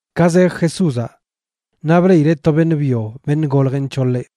Ka zej Jesúzaꞌ naꞌ bleꞌileꞌ to beṉꞌ byo beṉꞌ goljeꞌ nc̱hoḻeꞌ.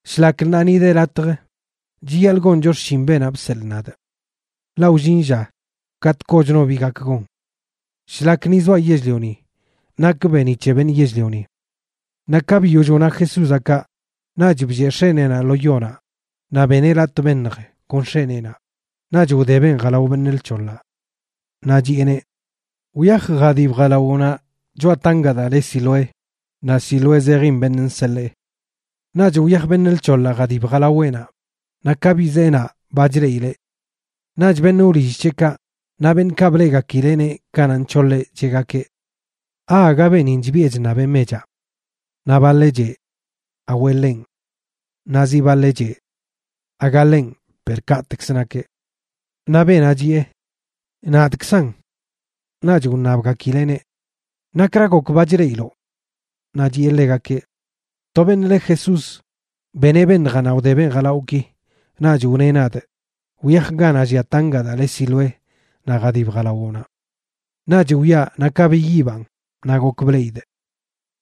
Shlak ṉaa ni de latj, chiyaḻꞌ goncho xshin beenaꞌ bseḻꞌ nadꞌ. Ḻaꞌ wllin lla katꞌ kochno bi gak gon. Shlak ni zoaꞌ yell-lioni nakꞌ beeniꞌ c̱he beṉꞌ yell-lioni. Naꞌ ka biyoll wna Jesúzaꞌ kaꞌ, naꞌch blleꞌ x̱eneenaꞌ lo yonaꞌ naꞌ beneꞌ latꞌ beṉj kon x̱eneenaꞌ, naꞌch wdebeꞌn jalao beṉꞌ lc̱hoḻaꞌ. Naꞌ chiꞌeneꞌ: ―Wyaj jadib jalawoꞌnaꞌ choꞌa tangaꞌ daa le Siloé ―naꞌ Siloé zejin Beṉꞌ Nseḻee. Naꞌch wyaj beṉꞌ lc̱hoḻaꞌ jadib jalaweꞌnaꞌ, naꞌ ka bizee naꞌ, ba chleꞌileꞌ. Naꞌch beṉꞌ wlill c̱heꞌkaꞌ naꞌ beṉꞌkaꞌ bleꞌgakileꞌneꞌ kanaꞌ nc̱hoḻeꞌ cheꞌgakeꞌ: ―¿Aaga beenin chbiꞌe chṉabeꞌ mechaꞌ? Naꞌ baḻeꞌ cheꞌ: ―Awe, ḻenꞌ. Naꞌ zi baḻeꞌ cheꞌ: ―Aga ḻenꞌ, per kaꞌtekzə nakeꞌ. Naꞌ beenaꞌ chiꞌe: ―Nadꞌkzanꞌ. Naꞌch wṉabgakileꞌneꞌ: ―¿Nakra gok ba chleꞌiloꞌ? Naꞌ chiꞌe ḻegakeꞌ: ―To beṉꞌ le Jesús beneꞌ beṉjaꞌ naꞌ wdebeꞌn jalawꞌki naꞌch wneꞌ nadꞌ: “Wyaj ganaꞌ llia tangaꞌ daa le Siloé naꞌ jadib jalawoꞌnaꞌ.” Naꞌch wyaa naꞌ ka biyibaꞌn, naꞌ gok bleꞌidꞌ.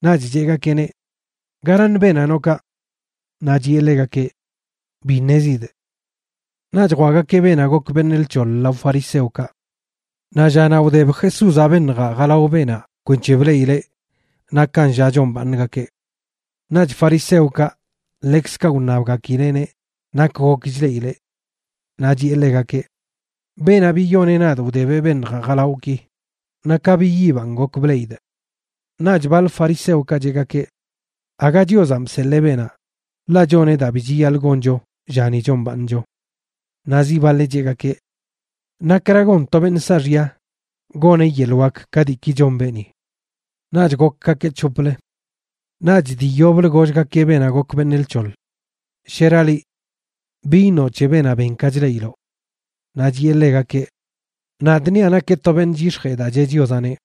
Naꞌch cheꞌgakeꞌneꞌ: ―¿Garaṉ beenaꞌ noꞌ kaꞌ? Naꞌ chiꞌe ḻegakeꞌ: ―Bi ṉezidꞌ. Naꞌch jwaꞌgakeꞌ beenaꞌ gok beṉꞌ lc̱hoḻ lao fariseokaꞌ. Naꞌ llanaꞌ wdeb Jesúzaꞌ beṉjaꞌ jalao beenaꞌ kwenc̱he bleꞌileꞌ nakan lla chombaaṉgakeꞌ. Naꞌch fariseokaꞌ ḻekzkaꞌ wṉabgakileꞌneꞌ nak gok chleꞌileꞌ. Naꞌ chiꞌe ḻegakeꞌ: ―Beenaꞌ biyoneꞌ nadꞌ wdebeꞌ beṉjaꞌ jalawꞌki, naꞌ ka biyibaꞌn gok bleꞌidꞌ. Naꞌch baḻ fariseokaꞌ cheꞌgakeꞌ: ―Aga Chiozanꞌ bseḻee beenaꞌ, ḻaꞌ choneꞌ daa bi chiyaḻꞌ goncho llani chombaaṉcho. Naꞌ zi baḻeꞌ cheꞌgakeꞌ: ―¿Nakra gon to beṉꞌ saaxya goneꞌ yeḻꞌ wak ka diiki chon beeni? Naꞌch gokgakeꞌ c̱hoplə. Naꞌch dii yoblə gollgakeꞌ beenaꞌ gok beṉꞌ lc̱hoḻ: ―¿Shera liꞌ? ¿Bi iṉoꞌ c̱he beenaꞌ ben ka chleꞌiloꞌ? Naꞌ chiꞌe ḻegakeꞌ: ―Nadꞌ niaꞌ nakeꞌ to beṉꞌ chyix̱jee daa cheꞌ Chiozaꞌneꞌ.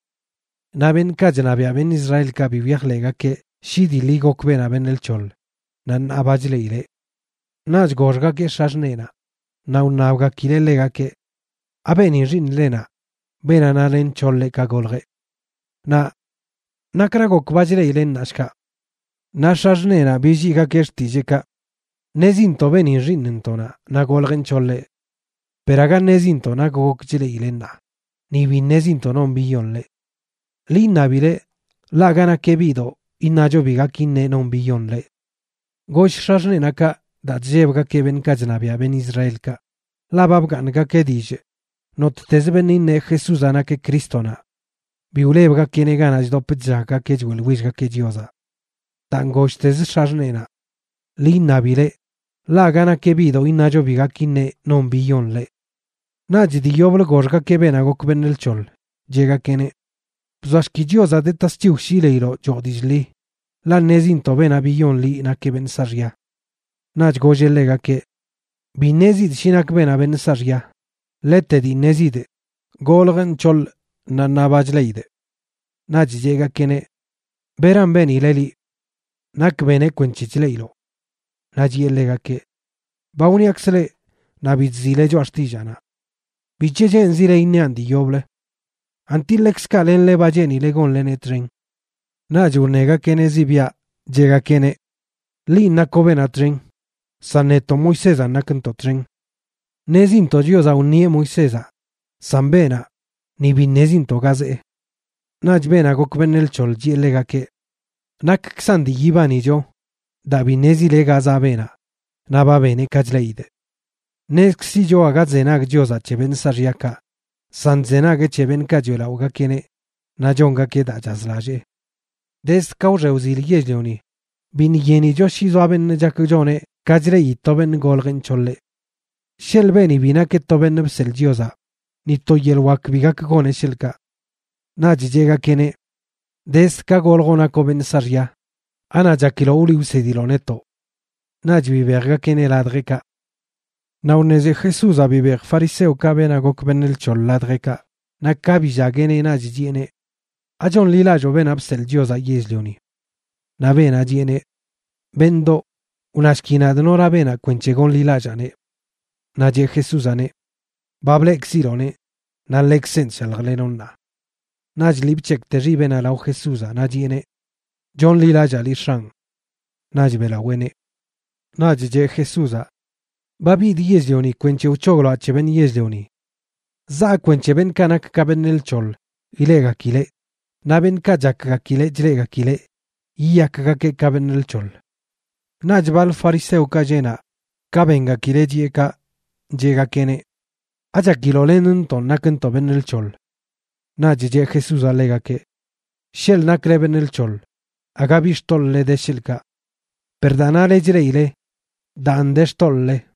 Naꞌ beṉꞌkaꞌ chṉabiaꞌ beṉꞌ Israelkaꞌ bi wyajḻeꞌgakeꞌ shi dii ḻi gok beenaꞌ beṉꞌ lc̱hoḻ naꞌ ṉaa ba chleꞌileꞌ. Naꞌch goxgakeꞌ x̱axṉeenaꞌ, naꞌ wṉabgakileꞌ ḻegakeꞌ: ―¿Abeenin xiiṉlenaꞌ, beenaꞌ nale nc̱hoḻeꞌ ka goljeꞌ? Naꞌ ¿nakra gok ba chleꞌileꞌ ṉaa, shkaꞌ? Naꞌ x̱axṉeenaꞌ billiigakeꞌ xtilleekaꞌ: ―Ṉezintoꞌ beenin xiiṉntoꞌnaꞌ naꞌ goljeꞌ nc̱hoḻeꞌ. Per aga ṉezintoꞌ nak gok chleꞌileꞌ ṉaa, ni bi ṉezintoꞌ non biyon ḻeꞌ. Ḻi iṉabileꞌ, ḻaꞌ aga nakeꞌ biꞌdoꞌ iṉacho bi gak iṉeꞌ non biyon ḻeꞌ. Goll x̱axṉeenaꞌ kaꞌ daa chllebgakeꞌ beṉꞌkaꞌ chṉabiaꞌ beṉꞌ Israelkaꞌ, ḻaꞌ ba bgaaṉgakeꞌ dillꞌ nottezə beṉꞌ iṉeꞌ Jesúzaꞌ nakeꞌ Crístonaꞌ bi wlebgakeꞌneꞌ ganaꞌ chdop chllaggakeꞌ choeꞌḻwillgakeꞌ Chiozaꞌ. Daan golltezə x̱axṉeenaꞌ: “Ḻi iṉabileꞌ, ḻaꞌ aga nakeꞌ biꞌdoꞌ iṉacho bi gak iṉeꞌ non biyon ḻeꞌ.” Naꞌch dii yoblə goxgakeꞌ beenaꞌ gok beṉꞌ lc̱hoḻ, cheꞌgakeꞌneꞌ: ―Bzoashki Chiozaꞌ de tasc̱hiw shi leiloꞌ choo dillꞌ ḻi, ḻaꞌ ṉezintoꞌ beenaꞌ biyon liꞌ nakeꞌ beṉꞌ saaxya. Naꞌch golleꞌ ḻegakeꞌ: ―Bi ṉezidꞌ shi nak beenaꞌ beṉꞌ saaxya. Ḻete dii ṉezidꞌ, goljꞌ nc̱hoḻꞌ naꞌ ṉaa ba chleꞌidꞌ. Naꞌch cheꞌgakeꞌneꞌ: ―¿Beran benileꞌ liꞌ? ¿Nak beneꞌ kwenc̱he chleꞌiloꞌ? Naꞌ chiꞌe ḻegakeꞌ: ―Ba wniakzꞌ leꞌ, naꞌ bi chziꞌle choꞌa xtillaanaꞌ. ¿Bic̱he cheenzile iṉiaꞌn dii yoblə? ¿Anti ḻekzkaꞌ lenle ba cheenile gonleneꞌ txen? Naꞌch wṉegakeꞌneꞌ zibiaꞌ, cheꞌgakeꞌneꞌ: ―Linꞌ nakoꞌ beenaꞌ txen, san netoꞌ Moisézanꞌ nakntoꞌ txen. Ṉezintoꞌ Chiozaꞌ wṉieꞌ Moisézaꞌ, san beenaꞌ, ni bi ṉezintoꞌ ga zee. Naꞌch beenaꞌ gok beṉꞌ lc̱hoḻ chiꞌe ḻegakeꞌ: ―¡Nakkzan dii yibanicho daa bi ṉezile ga zaꞌ beenaꞌ naꞌ ba beneꞌ ka chleꞌidꞌ! Ṉezkzicho aga chzenag Chiozaꞌ c̱he beṉꞌ saaxyakaꞌ, san chzenagueꞌ c̱he beṉꞌkaꞌ choeꞌlaꞌogakeꞌneꞌ naꞌ chongakeꞌ daa chazlallee. Dezd ka wxe wzil yell-lioni biṉꞌ yenicho shi zoa beṉꞌ chak choneꞌ ka chleꞌi to beṉꞌ goljeꞌ nc̱hoḻeꞌ. Sheḻꞌ beeni bi nakeꞌ to beṉꞌ bseḻꞌ Chiozaꞌ, ni to yeḻꞌ wak bi gak goneꞌ, sheḻꞌkaꞌ. Naꞌch cheꞌgakeꞌneꞌ: ―Dezd ka goljoꞌ nakoꞌ beṉꞌ saaxya. ¿Anaꞌ chakiloꞌ wliꞌ wsediloꞌ netoꞌ? Naꞌch bibejgakeꞌneꞌ ladjeꞌkaꞌ. Naꞌ wṉezi Jesúzaꞌ bibej fariseokaꞌ beenaꞌ gok beṉꞌ lc̱hoḻ ladjeꞌkaꞌ, naꞌ ka billagueꞌneꞌ naꞌch chiꞌeneꞌ: ―¿Achonḻilalloo Beenaꞌ Bseḻꞌ Chiozaꞌ Yell-lioni? Naꞌ beenaꞌ chiꞌeneꞌ: ―Beṉꞌdoꞌ, wnashki nadꞌ nora beenaꞌ kwenc̱he gonḻilallaaneꞌ. Naꞌ cheꞌ Jesúzaꞌneꞌ: ―Ba bleꞌkziloꞌneꞌ, naꞌ ḻekzenꞌ chshaljlenoꞌ ṉaa. Naꞌch lii bc̱hekꞌte xibeꞌnaꞌ lao Jesúzaꞌ, naꞌ chiꞌeneꞌ: ―Chonḻilallaa liꞌ, X̱anꞌ ―naꞌch beꞌlaweeneꞌ. Naꞌch cheꞌ Jesúzaꞌ: ―Ba bidꞌ yell-lioni kwenc̱he wc̱hogloaꞌ c̱he beṉꞌ yell-lioni. Zaa kwenc̱he beṉꞌkaꞌ nak ka beṉꞌ lc̱hoḻ ileꞌgakileꞌ, naꞌ beṉꞌkaꞌ chakgakileꞌ chleꞌgakileꞌ yiyakgakeꞌ ka beṉꞌ lc̱hoḻ. Naꞌch baḻ fariseokaꞌ lleꞌ naꞌ, ka bengakileꞌ chiꞌe kaꞌ, cheꞌgakeꞌneꞌ: ―¿Achakiloꞌ lenntonꞌ nakntoꞌ beṉꞌ lc̱hoḻ? Naꞌch cheꞌ Jesúzaꞌ ḻegakeꞌ: ―Sheḻꞌ nakle beṉꞌ lc̱hoḻ, aga bi xtoḻꞌle de, sheḻꞌkaꞌ. Per daa nale chleꞌile, daan de xtoḻꞌle.